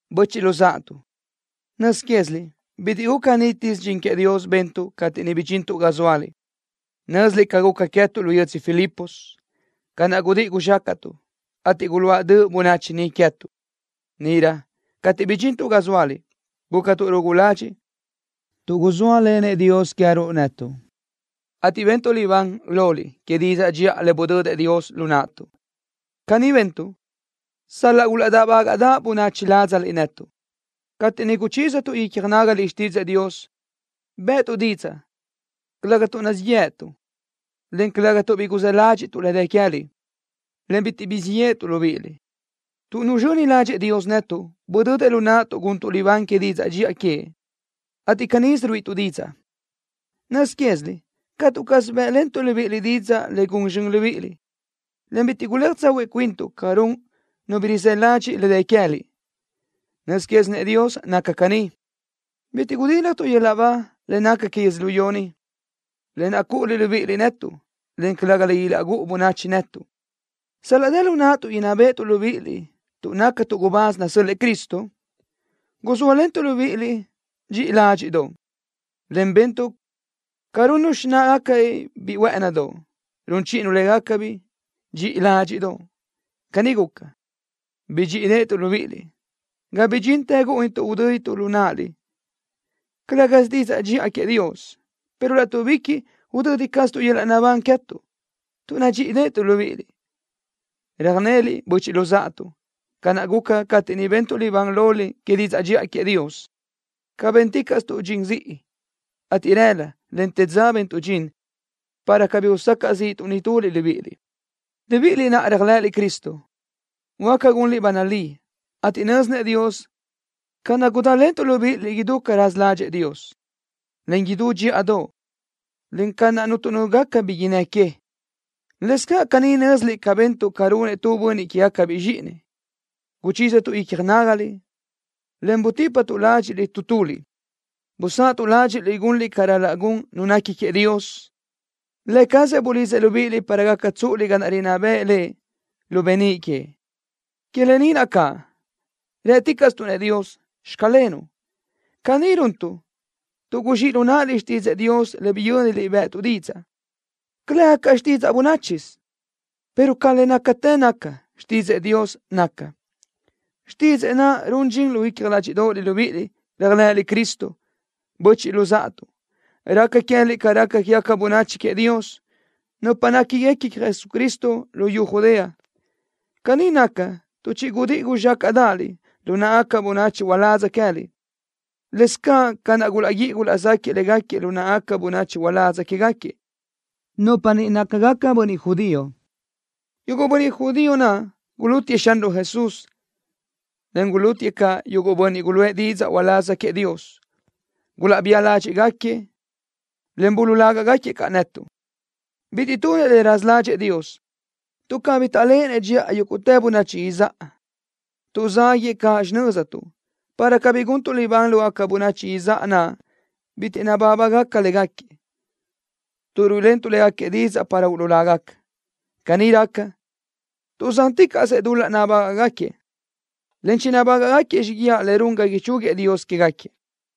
Böchiʼ luzáʼatuʼ, nöz quéziliʼ bitiʼ guca nítisö dxin queëʼ Dios bentuʼ cateʼ niʼ bidxintuʼ ga zóaliʼ. Nö́ziliʼ ca guca queë́tuʼ lu yödzö Filipos, ca naʼ gudíʼi guzxácaʼtuʼ, ateʼ guluáʼ döʼ bönachi niʼ queë́tuʼ. Níʼirö cateʼ bidxintuʼ ga zóaliʼ gúcatuʼ rugu ladxiʼ tuʼ guzóalenëʼ Dios queë́ruʼ netuʼ, ateʼ bentuʼ libán loliʼ que didzaʼ dxiʼa le budödëʼ Dios lu naʼtuʼ. Caní bentuʼ sal-laʼ gulaʼdáʼbagaʼdaʼ bönachi ládzaliʼ netuʼ. Cateʼ niʼ guchízatuʼ icja nágaliʼ xtídzëʼë Dios, bë́ʼëtuʼ didzaʼ, calëga tuʼ nazíʼi yeʼe netuʼ, en calëga tuʼ bi guzë́ ládxiʼtuʼ le dë queë́liʼ, en bitiʼ guzxíʼ yéʼetuʼ libíʼiliʼ. Tuʼ nuzxöni ládxëʼë Dios netuʼ, budödëʼ lu naʼtuʼ guntuʼ libán que didzaʼ dxiʼa queëʼ, ateʼ canísö ruíʼituʼ didzaʼ. Nöz quéziliʼ catu caz bë́ʼlentuʼ libíʼiliʼ didzaʼ le gun zxön libíʼiliʼ, en bitiʼ guléaj tsahuiʼ cuintuʼ ca run nu bi rizë́ ladxiʼ le dë queë́liʼ. Nöz quézinëʼ Dios naca caní. Bitiʼ gudíljatuʼ yöl-laʼ ba le naca que yödzölió ni, lë naʼ cúʼuliʼ libíʼiliʼ netuʼ, en calëga le ilaʼgúʼu bönachi netuʼ. Sal-laʼ dë lu naʼtuʼ inná béʼetuʼ libíʼiliʼ tuʼ nácatuʼ gubáz nasö́l-lëʼë Cristo guzóalentuʼ libíʼiliʼ dxiʼi ládxiʼdoʼ, en bentuʼ ca runnu xináʼagacabiʼ biʼi huë́ʼënidoʼ, run chíʼinu légacabiʼ dxiʼi ládxiʼdoʼ. Caní guca, bidxíʼideʼetuʼ libíʼiliʼ, ga bidxintë gúʼunituʼ udö́dituʼ lu náʼaliʼ, calë́gasö didzaʼ dxiʼa queëʼ Dios, pero láʼtuʼbiquiʼ udödi caztuʼ yöl-laʼ naʼbán queë́tuʼ, tuʼ nadxíʼideʼetuʼ libíʼiliʼ. Röjneliʼ, böchiʼ luzáʼatuʼ, ca naʼ guca cateʼ niʼ bentuʼ libán loliʼ que didzaʼ dxiʼa queëʼ Dios, ca bénticaʼstuʼ dxin ziʼi, ateʼ rëla, en të dza bentuʼ dxin para cabí usacaʼ zíʼituʼ nituliʼ libíʼiliʼ. Libíʼiliʼ naʼ réajlëʼëliʼ Cristo, huáca gunliʼ ba nalí, ateʼ nö́zinëʼ Dios ca naʼ gudálentuʼ libíʼiliʼ idú ca raza ládxëʼë Dios, en idú dxíʼadoʼ, en ca naʼ cuntu nu gaca bi innë́ que. Lëscaʼ caní nö́ziliʼ ca bentuʼ ca runëʼ tu bönniʼ quégacabiʼ zxíʼinëʼ, guchízatuʼ icja nágaliʼ, en butípatuʼ ládxiʼliʼ tu tuliʼ. Busáʼatuʼ ládxiʼliʼ gunliʼ ca ral-laʼ gun nu nequi queëʼ Dios. Lë cazëʼ bulidzëʼ libíʼiliʼ para gaca tsúʼuliʼ ga naʼ rinná bëʼë Lëʼ lu beníʼ queëʼ. Que lë ni naʼ caʼ, rë́ticaʼstuʼ-nëʼ Dios: “Xclenuʼ.” Caní runtuʼ tuʼ guzxíʼ lu náʼaliʼ xtídzëʼë Dios le biyö́niliʼ bë́ʼëtuʼ didzaʼ, calëga ca xtidzaʼ bönáchisö, pero ca le nácatë naca, xtídzëʼë Dios naca. Xtídzëʼë naʼ run dxin lu icja ládxiʼdoʼoliʼ libíʼiliʼ, réajlëʼëliʼ Cristo. Böchiʼ luzáʼatuʼ, raca queë́liʼ ca raca quégaca bönachi queëʼ Dios, nupa néquiguequi queëʼ Jesucristo luyú Judea. Caní naca tuʼ chigudíʼi guzxácaʼdaʼaliʼ lu náʼagaca bönachi uládz queë́liʼ, lë́bisö ca naʼ gulaʼguíʼi gulaʼzáquiëʼ légaquiëʼ lu náʼagaca bönachi uládz quégaquiëʼ, nupa niʼ nácagaca bönniʼ judío. Yuguʼ bönniʼ judío naʼ gulútiëʼ Xanruʼ Jesús, en gulútiëʼ caʼ yuguʼ bönniʼ guluʼë didzaʼ uláz queëʼ Dios. Gulaʼbía ládxiʼgaquiëʼ, en buluʼláguëʼ caʼ netuʼ. Bitiʼ tunëʼ le raza ládxëʼë Dios, tuʼ cabí taʼléʼenëʼ dxiʼa yúguʼtë bönachi izáʼa. Tuʼzáguëʼë caʼ xinöztuʼ, para cabí guntuʼ libán lógaca bönachi izáʼa naʼ bitiʼ nabábagaca légaquiëʼ, tuʼ ruíʼilentuʼ léguequi didzaʼ para uluʼlágaca. Caní raca, tuʼzánticaʼsëʼ dul-laʼ nabágaʼgaquiëʼ, en chinabágaʼgaquiëʼ xíguiaʼ le run ga ichúguiëʼ Dios quégaquiëʼ.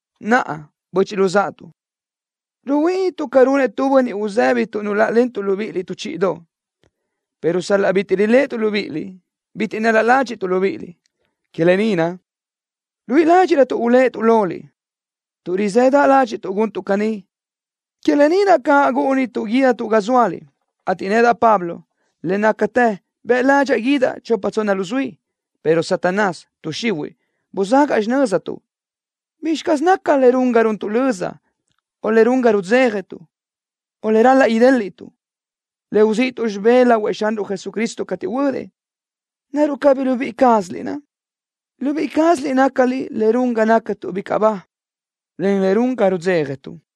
Naʼa, böchiʼ luzáʼatuʼ, ruhuíʼinituʼ ca runëʼ tu bönniʼ uzëbi tuʼ nuláʼalentuʼ libíʼiliʼ tu chíʼidoʼ, pero sal-laʼ bitiʼ riléʼetuʼ libíʼiliʼ, bitiʼ nál-la ládxiʼtuʼ libíʼiliʼ. Que lë ni naʼ, ruíʼi ládxiʼrötuʼ uléʼetuʼ loliʼ, tuʼ rizëdaʼ ládxiʼtuʼ guntuʼ caní. Que lë ni naʼ caʼ gúʼunituʼ guídatuʼ ga zóaliʼ, ateʼ nedaʼ, Pablo, le nácatë bëʼ ládxaʼa guídaʼ chopa tsonna luzuí, pero Satanás, tuʼ xihuiʼ, buzagaʼ xinöztuʼ. ¿Bizxi caz naca le run ga runtuʼ löza, o le run ga rudzéjatuʼ, o le ral-laʼ idéliʼtuʼ, le uzíʼituʼ xibé lahuëʼ Xanruʼ Jesucristo cateʼ huödëʼ? ¿Naruʼ cabí libíʼi cázaliʼ naʼ? Libíʼi cázaliʼ nácaliʼ le run ga nácatuʼ bicaʼ ba, en le run ga rudzéjatuʼ.